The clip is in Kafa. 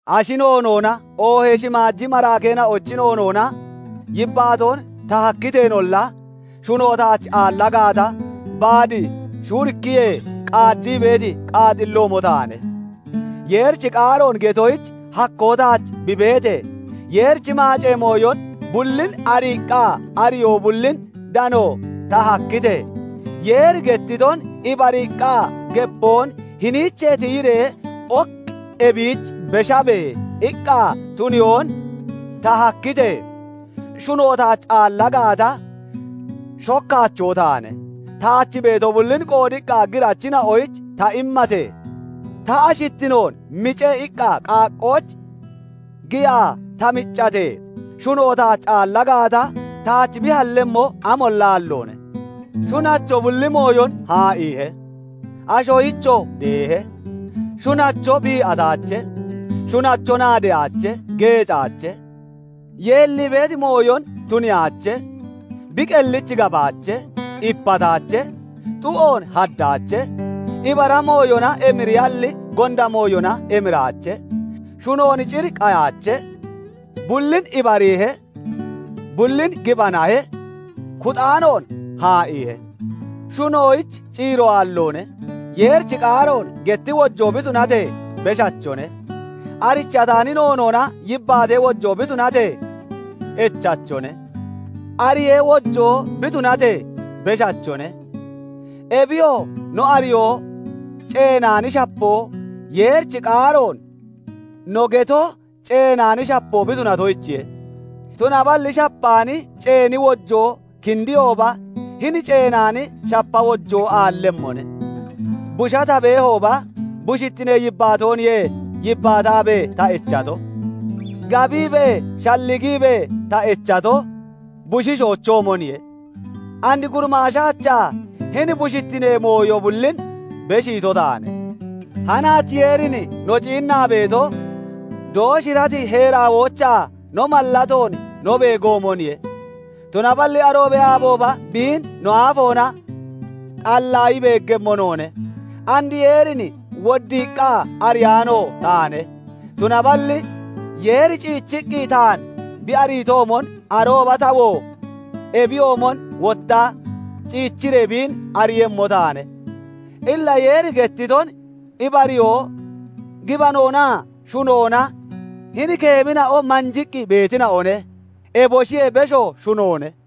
Ashi noonoona, oohee shimaaji maraakeena'ochi noonoona yibbaatoon ta hakkiteenolla, shuno taach aalla gaata, baad shuurikkiyee qaaddii beeti qaaxilloomo taane. Yeerichi qaaroon getoyich hakkoo taach bi beetee, Yeerichi maacee mooyo bullin ariiqqa ariyoo bullin dano ta hakkitee, Yeeri gettiton ibariiqqa gepoon "Hiniichee tiyiree ok ebiich beshabe" iqqa tuniyoon ta hakkitee, shuno taach aalla gaata, shokkaachoo taane. Taach beeto bullin qoodiqqa girachina'oyich ta immatee, "Ta ashittino mice" iqqa qaaqqooch giyaa ta miccatee, shuno taach aalla gaata, taach bi hallemmo amolla aalloone. Shunacho bulli mooyon haa'iihe; ashoyichoo deehe. Shunacho bii'ataache. Shunacho naadeyaache; geecaache; yeellii beeti mooyon tuniyaache; bi qellich gabaache; ipataache; xu'oon haddaache; ibara mooyona emiriyalli, gonda mooyona emiraache; shunon cir qayaache; bullin ibariihe; bullin gibanahe; kuxaanoon haa'iihe. Shunoyich ciiro aalloone; Yeerichi qaaroon getti wojoo bi tunatee, beshachone; arichataani noonoona yibbaatee wojoo bi tunatee, echachone; ariyee wojoo bi tunatee, beshachone. Ebiyoo no ariyoo ceenaani shapoo, Yeerichi qaaroon no getoo ceenaani shapoo bi tunatoyichiye; tunaballi shapaani ceeni wojoo kindiyooba, hini ceenaani shapa wojoo aallemmone. Busha ta beehooba, bushittinee yibbaatooniye yibbaataabee ta echato; gabiibee, shalligiibee ta echato bushiishoochoomoniye. And gurimaashaachaa, hini bushittinee mooyo bullin beshiito taane. Hanaach Yeerin no ciinnaa beeto, dooshirati heeraawoochaa no mallatoon no beegoomoniye; tunaballi aroobee aabooba biin no aafoona xallaayi beeggemmo noone. And Yeerin woddiiqqa ariyaano taane; tunaballi Yeeri ciichiqqi taan bi ariitoomon, arooba tawoo ebiyoomon wotta ciichiree biin ariiyemmo taane. Illa Yeeri gettiton ibariyoo, gibanoonaa shunoona hini keemina'o manjiqqi beetina'one. Eboshiyee besho shunoone.